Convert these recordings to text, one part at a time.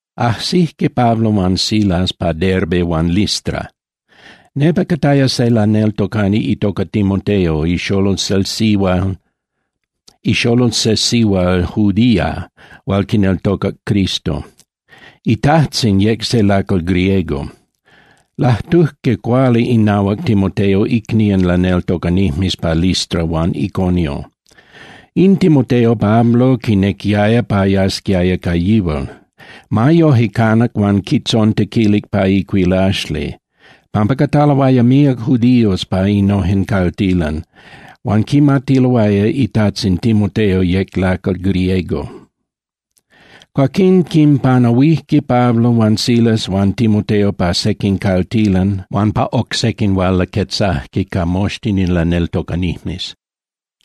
Ajsijque Pablo huan Silas pa Derbe huan Listra. Nepa cataya se laneltocani itoca Timoteo, ixolol se sihual judía hual quineltocac Cristo. Itajtzin yec se lacal griego. Lajtujque cuali inahuac Timoteo icnían laneltocanijmes pa Listra huan Iconio. In Timoteo Pablo quinequiaya pa yasquiaya ca yihual. Ma yoje canac huan quitzontequilic pa icuilaxli, pampa cataloaya míac judíos pa innojen caltilan huan quimatiloaya itajtzin Timoteo yec lacal griego. Cuaquín quinpanahuijque Pablo huan Silas huan Timoteo pa sequin caltilan huan pa oc sequin huan laquetzajque ca moxtin in laneltocanijmes.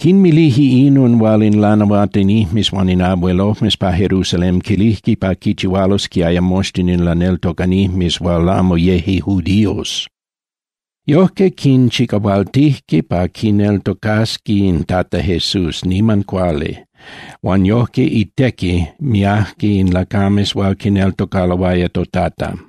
Quinmilije inon hual in lanahuatinijmes huan in abuelojmes pa Jerusalén quilijque pa quichihualosquiaya moxtin in laneltocanijmes hual amo yeje judíos. Yojque, quinchicahualtijque pa quineltocasqui in Tata Jesús niman cuali, huan yojque itequi miajque in lacames hual quineltocaloaya toTata.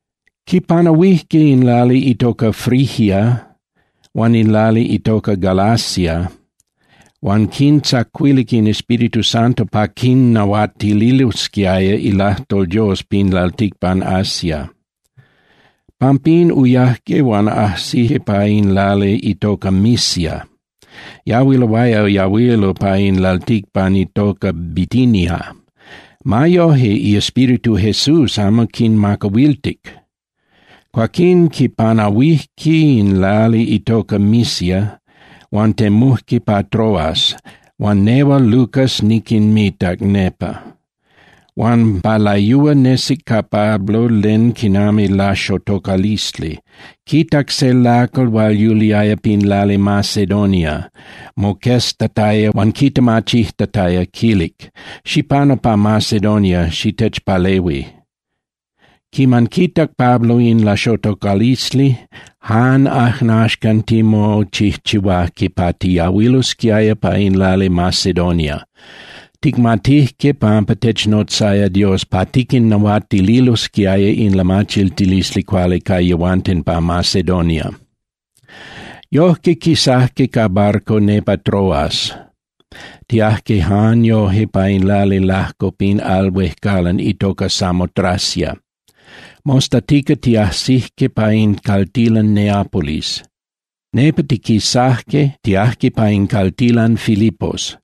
Quipanahuijque in lali itoca Frigia huan in lali itoca Galacia, huan quintzacuilic in Espíritu Santo pa camo quinnahuatililosquiaya ilajtol Dios pin lalticpan Asia. Pampín, uyajque huan ajsijque pa in lali itoca Misia, yahuiloaya yahuilo pa in lalticpan itoca Bitinia. Ma yoje, iEspíritu Jesús amo quinmacahuiltic. Cuaquín quipanahuijque in lali itoca Misia huan temujque pa Troas huan nehual Lucas niquinmitac nepa. Huan pa layúa nesic ca Pablo len quinami laxotocalisli, quitac se lacal hual yuliaya pin lali Macedonia, moqueztataya huan quitemachijtataya, quilic: “Xipanu pa Macedonia, xitechpalehui.” Quiman quitac Pablo in laxotocalisli, jan ajnaxcan timochijchihuajque pa tiyahuilosquiaya pa in lali Macedonia. Ticmatijque pampa technotzaya Dios pa tiquinnahuatililosquiaya in lamachiltilisli cuali ca yehuanten pa Macedonia. Yojque, quisajque ca barco nepa Troas, tiajque jan yoje pa in lali lajco pin al huejcalan itoca Samotracia. Mostatica tiajsijque pa in caltilan Neapolis. Nepa tiquisajque, tiajque pa in caltilan Filipos.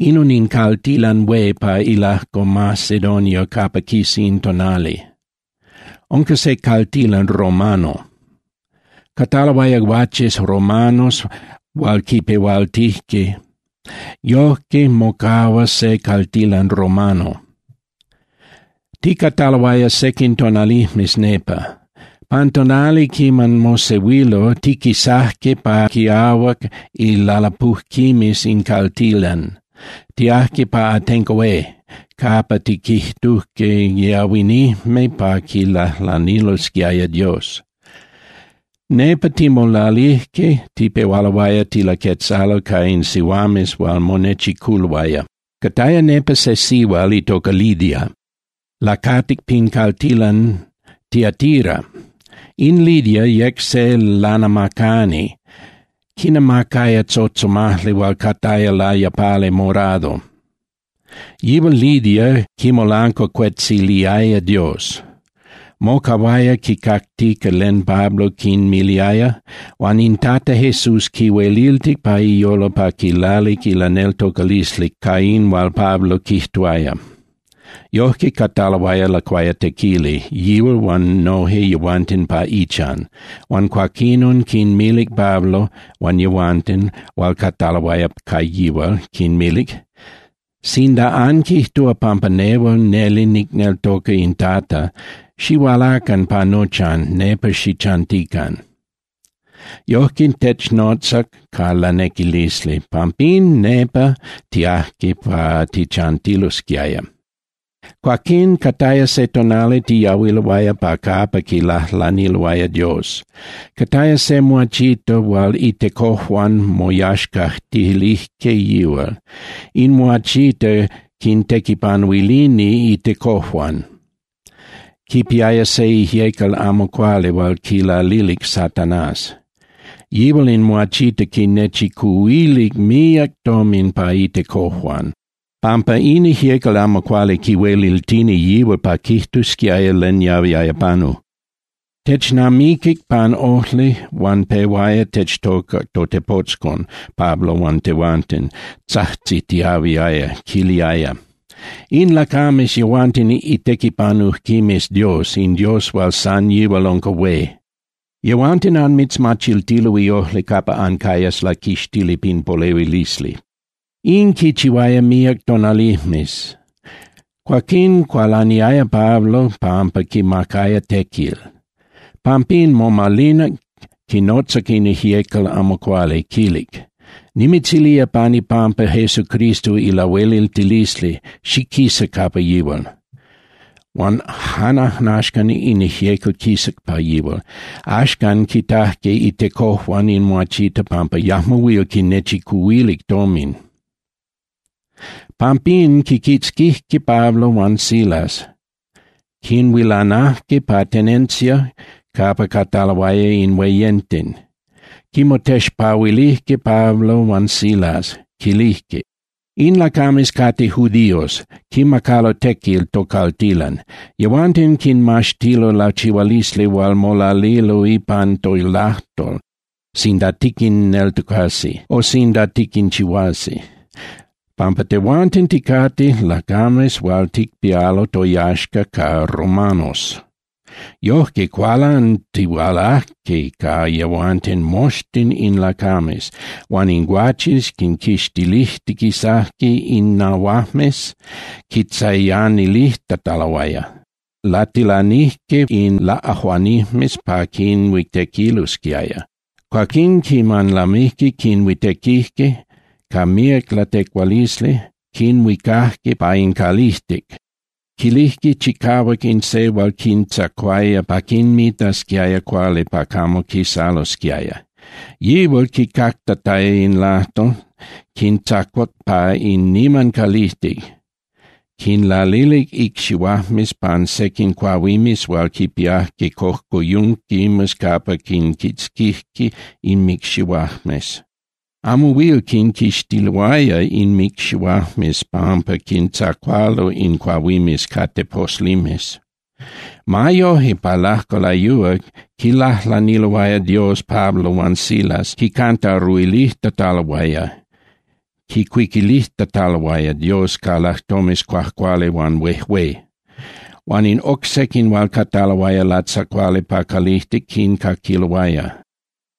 Inon in caltilan hué pa ilajco Macedonia capa quisa in tonali, unca se caltilan romano. Cataloaya guaches romanos hual quipehualtijque, yojque mocahua se caltilan romano. Ticataloaya sequin tonalijmes nepa. Pan tonali quiman mosehuilo, tiquisajque pa quiahuac ilalapujquimes in caltilan, tiajque pa atenco hué capa tiquijtujque yahuinijme pa quilajlanilosquiaya Dios. Nepa timolalijque, tipehualoaya tilaquetzalo ca in sihuames hual monechiculoaya. Cataya nepa se sihual itoca Lidia, lacatic pin caltilan Tiatira. In Lidia yec se lanamacani, quinamacaya tzotzomajli hual cataya layapali morado. Yihual Lidia quimolancuacuetziliaya Dios. Mocahuaya quicactica len Pablo quinmiliaya, huan in Tata Jesús quihueliltic pa iyolo pa quilalic ilaneltocalisli ca in hual Pablo quijtuaya. Yojque, cataloaya lacuayatequili, yihual huan noje yehuanten pa ichan, huan cuaquinon quinmilic Pablo huan yehuanten hual cataloaya ca yihual, quinmilic: —Sinda anquijtúa pampa nehual neli nicneltoca in Tata, xihualacan pa nochan, nepa xichantican. Yojque technotzac ca lanequilisli, pampín nepa tiajque pa tichantilosquiaya. Cuaquín cataya se tonali tiyahuiloaya pa capa quilajlaniloaya Dios, cataya se muachita hual itecojuan moyaxcajtilijque yihual. In muachita quintequipanuilini itecojuan, quipiaya se ijyecal amo cuali hual quilalilic Satanás. Yihual in muachita quinnechicuhuilic míac tomin pa itecojuan, pampa in ijyecal amo cuali quihueliltini yihual pa quijtusquiaya len yahuiaya panu. Technamiquic pan ojli huan pehuaya techtoca totepotzcon Pablo huan tehuanten, tzajtzitiahuiaya, quiliaya: —In lacames yehuanten itequipanujquimes Dios, in Dios hual san yihual unca hué. Yehuanten anmitzmachiltilo iojli capa ancayas laquixtili pin polehuilisli. In quichihuaya míac tonalijmes. Cuaquín cualaniaya Pablo pampa quimacaya tequil. Pampín momalinac quinotzac in ijyecal amo cuali, quilic: —Nimitzilía pan ipampa Jesucristo ilahueliltilisli, xiquisa capa yihual. Huan jan ajnaxcan in ijyecal quisac pa yihual. Axcan, quitajque itecojuan in muachita pampa yajmo huil quinechicuhuilic tomin. Pampín quinquitzquijque Pablo huan Silas, quinhuilanajque pin tenencia capa cataloaya in hueyenten. Quinmotexpahuilijque Pablo huan Silas, quilijque: —In lacames cate judíos, quimacalo tequil tocaltilan. Yehuanten quinmaxtilo lachihualisli hual molalilo ipan tolajtol sinda tiquinneltocasi o sinda tiquinchihuasi, pampa tehuanten ticate lacames hual ticpialo toyaxca ca romanos. Yojque, cualantihualajque ca yehuanten moxtin in lacames, huan in guaches quinquixtilijtiquisajque innahuajmes quintzayanilijtataloaya. Latilanijque in laꞌajuanijmes pa quinhuitequilosquiaya. Cuaquín quiman lamijque quinhuitequijque ca míac latecualisli, quinhuicajque pa in calijtic, quilijque chicahuac in se hual quintzacuaya pa quinmitasquiaya cuali pa camo quisalosquiaya. Yihual quicactataya in lajtol, quintzacuac pa in niman calijtic, quinlalilic icxihuajmes pan sequin cuahuimes hual quipiajque cojcoyunquimes capa quinquitzquijque inmicxihuajmes. Amo huil quinquixtiloaya inmicxihuajmes pampa quintzacualo in cuahuimes ca teposlimes. Ma yoje, pa lajco layúa, quilajlaniloaya Dios Pablo huan Silas huan quicantaruilijtataloaya (quicuiquilijtataloaya) Dios ca lajtomes cuajcuali huan huejué. Huan in oc sequin hual cataloaya latzacuali pa calijtic quincaquiloaya.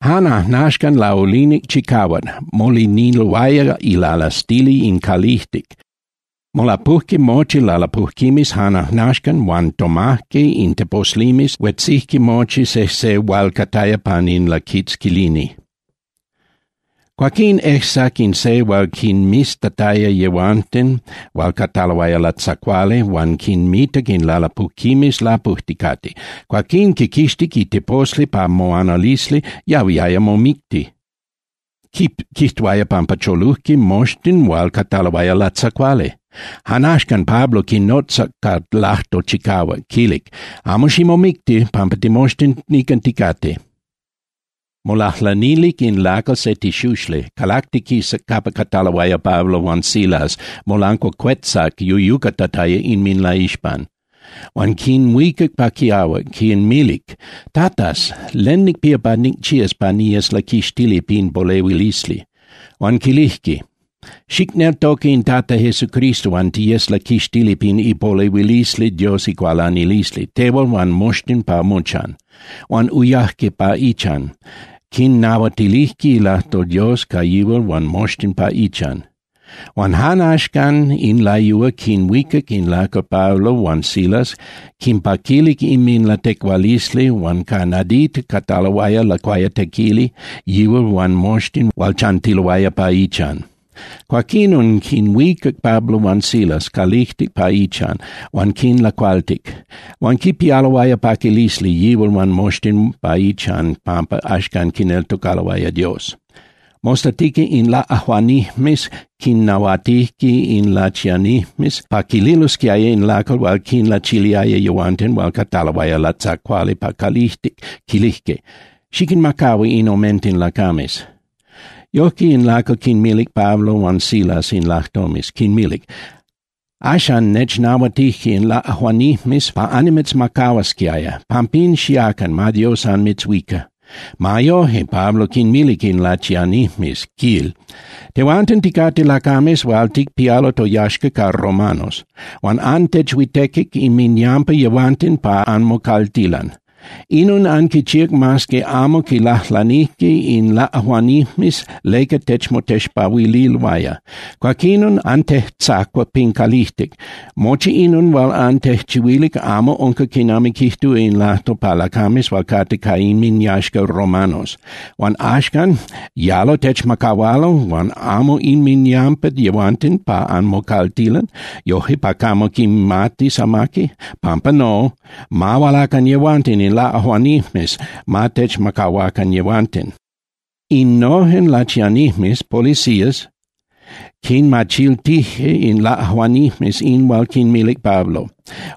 Jan ajnaxcan, laulinic chicahuac, moliniloaya ilalastili in calijtic, molapujque mochi lalapujquimes jan ajnaxcan huan tomajque in teposlimes, huetzijque mochi sejse hual cataya pan in laquitzquilini. Cuaquín ejsac in se hual quinmiztataya yehuanten hual cataloaya latzacuali huan quinmitac in lalapujquimes lapujticate. Cuaquín quiquixtic iteposli pa moanalisli, yahuiaya momicti, quijtuaya pampa cholujque moxtin hual cataloaya latzacuali. Jan axcan, Pablo quinotzac ca lajtol chicahuac, quilic: —Amo ximomicti, pampa timoxtin nican ticate. Molajlanilic in lacal se tixuxli, calactiquisac capa cataloaya Pablo huan Silas, molancuacuetzac yuyucatataya inminlaixpan. Huan quinhuicac pa quiahuac, quinmilic: —Tatas, ¿len nicpía pa nicchías pa niyes laquixtili pin polehuilisli? Huan quilijque: —Xicneltoca in Tata Jesucristo huan tiyes laquixtili pin ipolehuilisli Dios icualanilisli, tehual huan moxtin pa mochan. Huan uyajque pa ichan, quinnahuatilijque ilajtol Dios ca yihual huan moxtin pa ichan. Huan jan axcan in layúa quinhuicac in lacal Pablo huan Silas, quinpaquilic inminlatecualisli huan ca nadita cataloaya lacuayatequili yihual huan moxtin hual chantiloaya pa ichan. Cuaquinon quinhuicac Pablo huan Silas calijtic pa ichan huan quinlacualtic. Huan quipialoaya paquilisli yihual huan moxtin pa ichan pampa axcan quineltocaloaya Dios. Mostatica in laꞌajuanijmes quinnahuatijque in lachianijmes pa quililosquiaya in lacal hual quinlachiliaya yehuanten hual cataloaya latzacuali pa calijtic, quilijque: —Xiquinmacahua in omenten lacames. Yojque in lacal quinmilic Pablo huan Silas in lajtomes, quinmilic: —Axan nechnahuatije in laꞌajuanijmes pa annimitzmacahuasquiaya. Pampín, xiacan, ma Dios anmitzhuica. Ma yoje, Pablo quinmilic in lachianijmes, quil: —Tehuanten ticate lacames hual ticpialo toyaxca ca romanos. Huan antechhuitequic inminyampa yehuanten pa anmocaltilan. Inon anquichíac mas que amo quilajlanijque in laꞌajuanijmes leca techmotexpahuililoaya. Cuaquinon antejtzacuac pin calijtic. Mochi inon hual antejchihuilic amo unca quinami quijtúa in lajtol pa lacames hual cate ca inminyaxca romanos. Huan axcan ¿yalo techmacahualo huan amo inminyampa yehuanten pa anmocaltilan, yojque pa camo quimatis amaqui? Pampa no. Ma hualacan yehuanten in laꞌajuanijmes, ma techmacahuacan yehuanten. Innojen lachianijmes (policías) quinmachiltije in laꞌajuanijmes in hual quinmilic Pablo.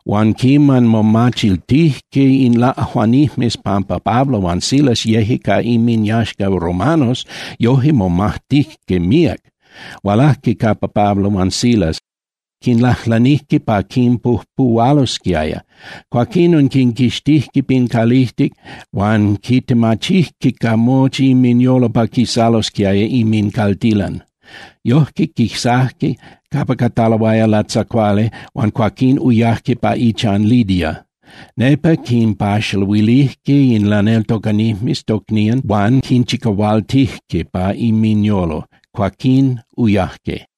Huan quiman momachiltijque in laꞌajuanijmes pampa Pablo huan Silas yeje ca inminyaxca romanos, yojque momajtijque míac. Hualajque capa Pablo huan Silas, quinlajlanijque pa quinpujpuhualosquiaya. Cuaquinon quinquixtijque pin calijtic huan quintemachijque ca mochi inminyolo pa quisalosquiaya inmincaltilan. Yojque quisajque capa cataloaya latzacuali huan cuaquín uyajque pa ichan Lidia. Nepa quinpaxaluilijque in laneltocanijmes tocnían huan quinchicahualtijque pa inminyolo, cuaquín uyajque.